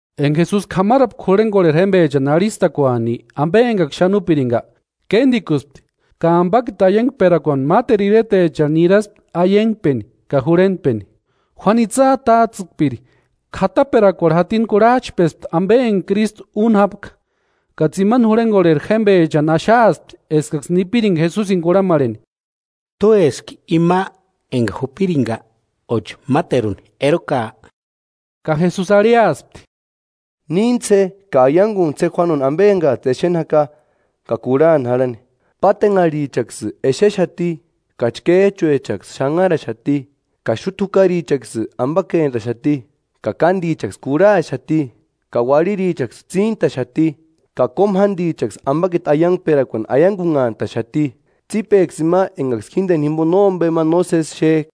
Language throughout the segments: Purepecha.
Enka Jesusi k'amarapka jurhenkorheri jémpechani arhistakuani ampe enkaksï xáni úpirinka, kéntikuspti, ka ampakiti aiankperakuani máteru iretecharhu niraspti aiankpeni ka jurhentpeni. Juánu itsï atats'ïkpiri k'ataperakuarhu jatini kurhach'pespti ampe enka Krístu úni jápka, ka tsimani jurhenkorheri jémpechani axaaspti eskaksï nipirinka Jesusini kurhamarheni: “¿T'úeski ima enka jupirinka, óchi máteruni erokaa?” Ka Jesusi arhiaspti: “Níntsï je ka aiankuntsï je Juánuni ampe enkats'ï exeni jaka ka kurhani jarhani. Pátenharhichaksï exexati, ka chkéch'uechaksï xanharaxati ka xúta jukarichaksï ampakentaxati; ka kántichaksï kurhaxati ka uarhirichaksï tsíntaxati, ka kómu jántichaksï ampakiti aiankperakuani aiankunhantaxati. Tsípeksï ima enkaksï jínteni jimpo nómpe ma nósesi exek'a.”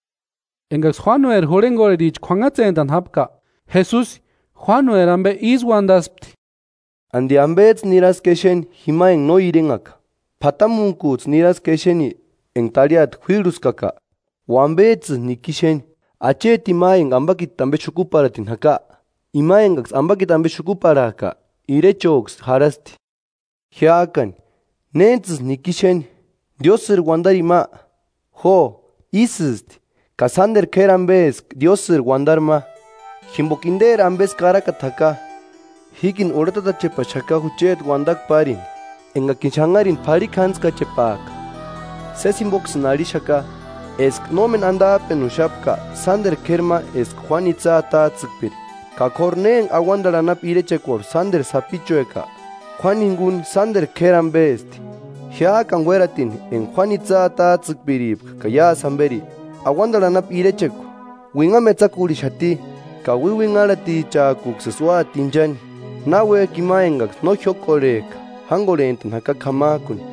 Enkaksï Juánueri jurhenkorhericha k'uanhatsentani jápka, Jesusi Juánueri ampe ísï uantaspti: “¿Anti ampets'ï niraski exeni jima enka no irenhaka? ¿P'atamuntkuts'ï niraski exeni enka tarhiata juírhuskaka? ¿O ampets'ïsï niki exeni? ¿Achetini ma enka ampakiti ampe xukuparhatini jaka? Ima enkaksï ampakiti ampe xukuparhak'a, irechoksï jarhasti. Jiák'ani, ¿Néntsïsï niki exeni? ¿Diósïri uantarini ma? Jo, ísïsti, ka sánteru k'éri ampe eska Diósïri uantari ma, jimpoka interi ampesï karakata jaka: ‘Jíkini urhetatachepaxaka jucheti uantakua párini, enkakini xanharini p'arhikjantskachepaaka.’” “Sési jimpoksïni arhixaka, eska nómeni antap'enuxapka sánteru k'éri ma eska Juánu itsï atats'ïkpiri, ka k'óru ne enka auantarhu anapu irechekuarhu sánteru sapichueka, Juánu jinkuni sánteru k'éri ampesti.” “Jiák'ani uératintki enka Juánu itsï atats'ïkpirika ka iásï jamperi, auantarhu anapu irechekua uinhamu etsakurhixati, ka uiuinharhatichak'uksïsï úati inchani, náuek'i ima enkaksï no jiókorhek'a jánkorhent'ani jaka k'amak'uni.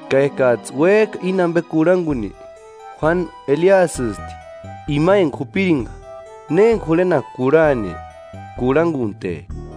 Ka ekats'ï uék'a íni ampe kurhankuni, Juánu Eliasïsti, ima enka jupirinka. Ne enka jurhenaka kurhani, kurhankunte.”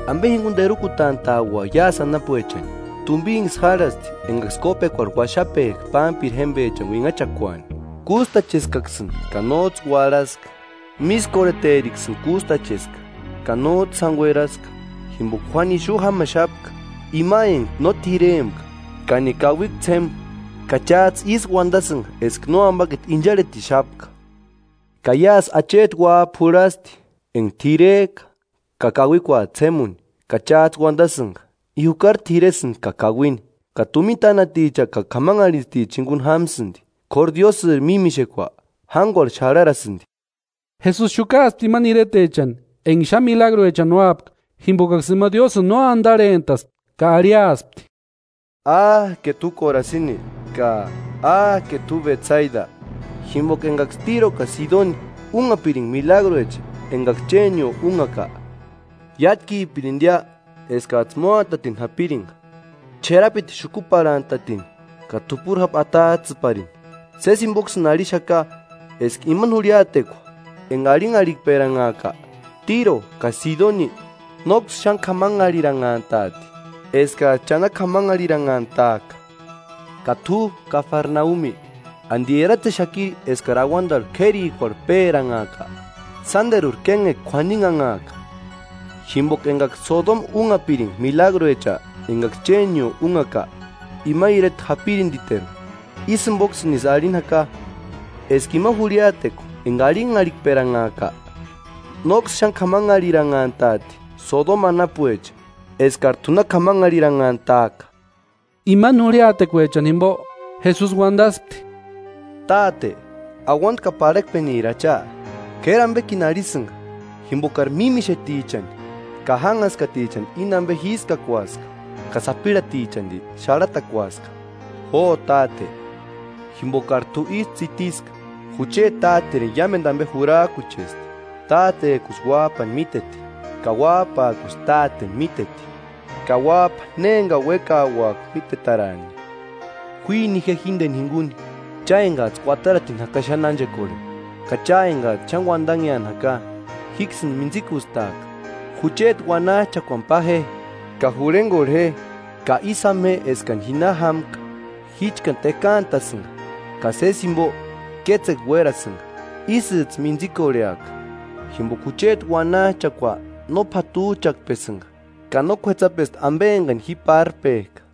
“¿Ampe jinkuni terukutant'a'ua iásï anapuechani? Tumpinksï járhasti enkaksï kópekuarhu uaxapek'a pámpiri jémpechani uinhachakuani: ‘Kústacheskaksïni ka nóts'ï uarhaska; mískorheteriksïni kústacheska, ka nóts'ï sáni ueraska.’ Jimpoka Juánu ixu jámaxapka, ima enka no t'irempka ka ni kauikua ts'ému, ka cháts'ï ísï uantasïnka eska nóampakiti incharhetixapka. Ka iásï acheti uáp'a jurhasti, enka t'irek'a ka kauikuat'u ts'émuni ka cháts'ï uantasïnka: ‘I jukari t'iresïnti ka kauini, ka tumina tánaticha ka k'amanharhintsticha jinkuni jámasïnti.’ K'óru Diósïri mímixekua, jánkuarhu xarharasïnti.” Jesusi xukaaspti imani iretechani enka xáni milagruechani úapka, jimpokaksï ima Diósïni no antarhent'aska ka arhiaspti: “¡Áke t'u Korasini! Ka ¡Áke t'u Betsaida! Jimpoka enkaksï Tíro ka Sidoni únhapirinka milagruecha enkaksï chénio únhaka, iátkipirintia eskats'ï móantatini japirinka ch'erapiti xukuparhantatini ka t'upuri jápu atats'ïparini. Sési jimpoksïni arhixaka eska imani jurhiatekua enka arhinharhikperanhaaka, Tíro ka Sidoni nóksï xáni k'amanharhiranhant'aati eskats'ï cha na k'amanharhiranhantaaka. Ka t'u Kafarnaumi, ¿Anti eratsexakiri eskari auantarhu k'érikuarhu péranhaaka? Sánteruri kénhekua k'uaninhanhaaka, jimpoka enkaksï Sodoma únhapirinka milagruecha enkaksï chénio únhaka, ima ireta japirintiteru. Ísï jimpoksïnisï arhini jaka, eska ima jurhiatekua enka arhinharhikperanhaaka, nóksï xáni k'amanharhiranhant'aati Sodoma anapuecha, eskari t'u na k'amanharhiranhantaaka.” Imani jurhiatekuechani jimpo, Jesusi uantaspti: “Táte, auanta ka parhakpeniri Acha, k'éri ampekini arhisïnka, jimpokari mímixetichani ka jánhaskatichani íni ampe jískakuaska, ka sapirhatichanti xarhatakuaska. Jo Táte, jimpokari t'u ísï tsitiska.” “Jucheti Táterini iámentu ampe jurak'uchesti. Tátek'usï Uáp'ani míteti, ka Uáp'ak'usï Táteni míteti, ka Uáp'a ne enkani uékauaka mítetaraani.” “Juini je jínteni jinkuni cha enkats'ï kuataratini jaka xáni ánchekorheni, ka cha enkats'ï xáni uantanheani jaka, jíksïni mintsikustaaka. Jucheti uanach'akuani pa je, ka jurhenkorhe je, ka ísï jama je eskani ji na jámka, jíchkani tekaantasïnka ka sési jimpo kétsekua uérasïnka, ísïts'ï mintsikorheaka. Jimpoka jucheti uanach'akua no p'atuch'akpesïnka ka no k'uetsapesti ampe enkani ji párpek'a.”